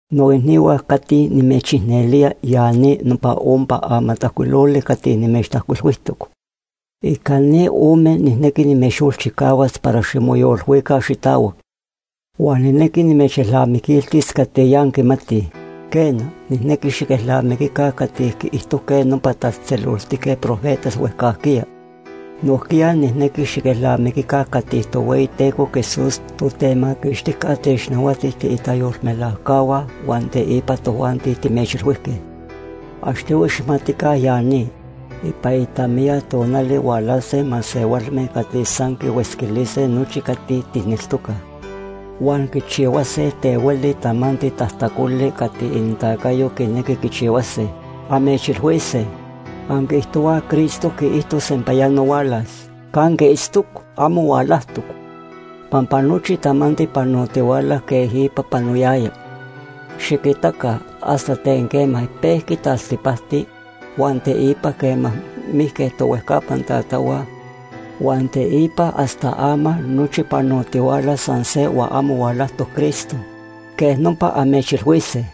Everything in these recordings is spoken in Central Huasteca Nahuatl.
Noicnihua cati nimechicnelía, ya ni nopa ompa amatajcuiloli cati nimechtajcuilhuijtoc. Ica ni ome nijnequi nimechyolchicahuas para ximoyolilhuica xitahuac. Huan nijnequi nimechelnamiquiltis cati ya anquimatij. Quena, nijnequi xiquelnamiquica cati quiijtojque nopa tatzejtzeloltique profetas huejcajquiya. Nojquiya nijnequi xiquelnamiquica cati Tohueyiteco Jesús, Totemaquixtijca, technahuati tiitayolmelajcahua huan teipa tojuanti timechilhuijque. Achtohui xijmatica ya ni. Ipan itamiya tonali hualase masehualme cati san quihuetzquilise nochi cati tijneltocaj, huan quichihuase ten hueli tamanti tajtacoli cati inintacayo quinequi quichihuase. Amechilhuise: “Anquiijtohuaj Cristo quiijto sempayano hualas. ¿Canque itztoc? Amo hualajtoc. Pampa nochi tamanti panotihuala quej ipa panoyaya. Xiquitaca hasta ten quema pejqui taltipacti, huan teipa quema mijque tohuejcapan tatahua, huan teipa hasta ama nochi panotihuala san se huan amo hualajtoc Cristo.” Quej nopa amechilhuise.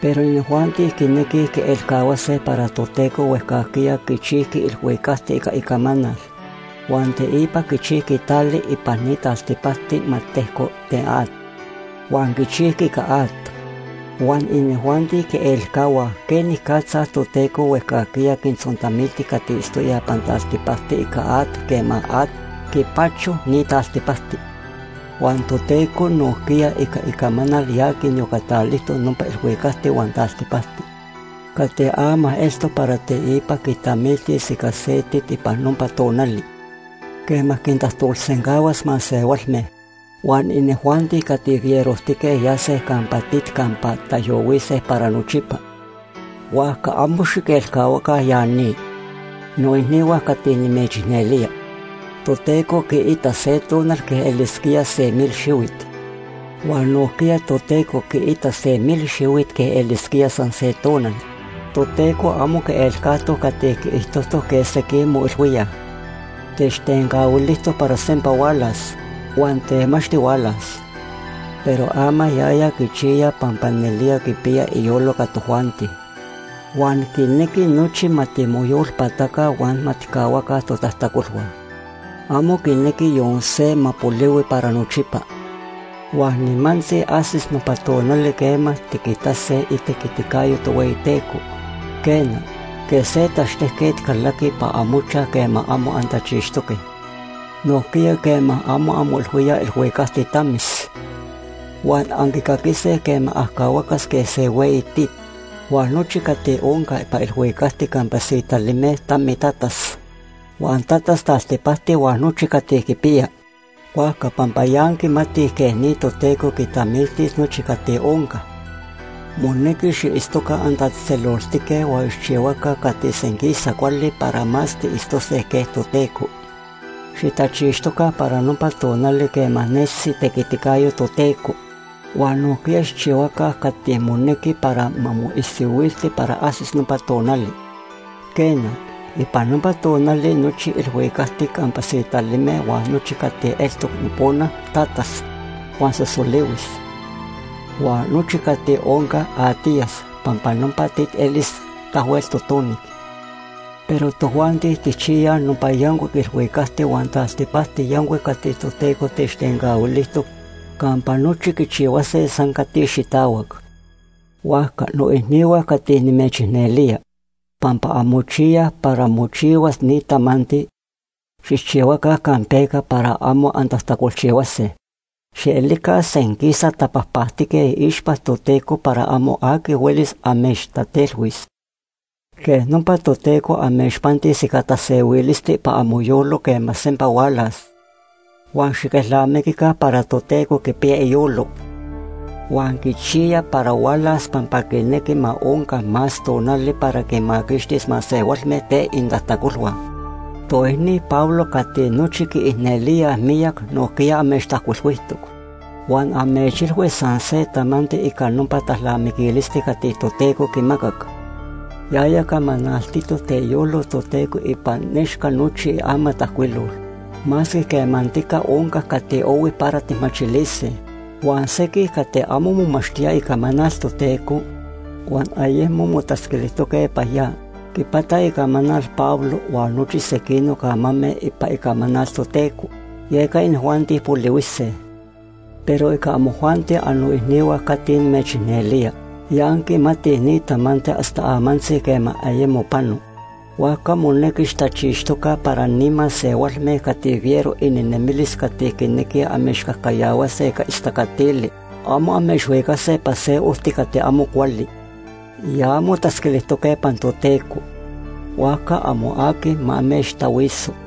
Pero inijuanti quinequij quielcahuase para Toteco huejcajquiya quichijqui ilhuicacti ica icamanal, huan teipa quichijqui tali ipan ni taltipacti ma tejco ten at, huan quichijqui ica at. Huan inijuanti quielcahuaj quenicatza Toteco huejcajquiya quintzontamilti cati itztoyaj ipan taltipacti ica at quema at quipacho ni taltipacti. Huan Toteco nojquiya ica icamanal ya quiniyocatalijtoc nopa ilhuicacti huan ni taltipacti cati ama eltoc para teipa quitamiltis ica se tit ipan nopa tonali quema quintajtolsencahuas masehualme. Huan inijuanti cati fierojtique yase campa tit campa taijyohuise para nochipa. Huajca amo xiquelcahuaca ya ni, noicnihua cati nimechicnelía: Toteco quiita se tonali quej elisquía se mil xihuit. Huan nojquiya Toteco quiita se mil xihuit quej elisquía san se tonal. Toteco amo quielcajtoc cati quiijtojtoc quej sequij moilhuíaj. Techtencahuilijtoc para sempa hualas, huan temachti hualas. Pero ama yaya quichiya pampa nelía quipiya iyolo ica tojuanti huan quinequi nochi ma timoyolpataca huan ma tijcahuaca totajtacolhua. Amo quinequi yon se ma polihui para nochipa. Huan nimantzi ajsis nopa tonali quema tiquitase itequiticayo Tohueyiteco. Quena, quej se tachtejquet calaqui ipan amochaj quema amo antachixtoque, nojquiya quema amo anmoilhuíaj, ilhuicacti tamis. Huan anquicaquise quema ajcahuacas quej se hueyi tit, huan nochi cati onca ipan ilhuicacti campa sitalime tamitatas. Huan tatas taltipacti huan nochi cati quipiya. Huajca pampa ya anquimatij quej ni Toteco quitamiltis nochi cati onca, monequi xiitztoca antatzejtzeloltique huan xijchihuaca cati senquisa cuali para más tiitztiyase quej Toteco. Xitachixtoca para nopa tonali quema nesis itequiticayo Toteco huan nojquiya xijchihuaca cati monequi para ma moisihuilti para ajsis nopa tonali. Quena, ipan nopa tonali nochi ilhuicacti campa sitalime huan nochi cati eltoc nopona tatas huan sosolihuis, huan nochi cati onca atiyas pampa nopa tit elis tahuel totonic. Pero tojuanti tijchiyaj nopa yancuic ilhuicacti huan taltipacti yancuic cati Toteco techtencahuilijtoc campa nochi quichihuase san cati xitahuac. Huajca noicnihua cati nimechicnelía, pampa anmochiyaj para mochihuas ni tamanti, xijchihuaca campeca para amo antajtacolchihuase. Xielica senquisa tapajpactique iixpa Toteco para amo aqui huelis amechtatelhuis. Quej nopa Toteco amechpantis ica tasehuilisti ipan amoyolo quema sempa hualas. Huan xiquelnamiquica para Toteco quipiya iyolo huan quichiya para hualas pampa quinequi ma onca más tonali para quinmaquixtis masehualme ten inintajtacolhua. Toicni Pablo cati nochi quiicnelíaj miyac nojquiya amechtajcuilhuijtoc huan amechilhui san se tamanti ica nopa talnamiquilisti cati Toteco quimacac. Yaya camanaltitoc ten iyolo Toteco ipan nechca nochi iamatajcuilol masque quemantica onca cati ohui para tijmachilise. Huan sequij cati amo momachtíaj Icamanal Toteco huan ayemo motatzquilijtoque ipan ya, quipataj icamanal Pablo huan nochi sequinoc amame ipan Icamanal Toteco, yeca inijuanti polihuise. Pero ica amojuanti annoicnihua cati nimechicnelía, ya anquimatij ni tamanti hasta amantzi quema ayemo pano. Huajca monequi xitachixtoca para ni masehualme cati fiero ininemilis cati quinequij amechcajcayahuase ica istacatili amo amechhuicase ipan se ojti cati amo cuali. Ya anmotatzquilijtoque ipan Toteco, huajca amo aqui ma amechtahuiso.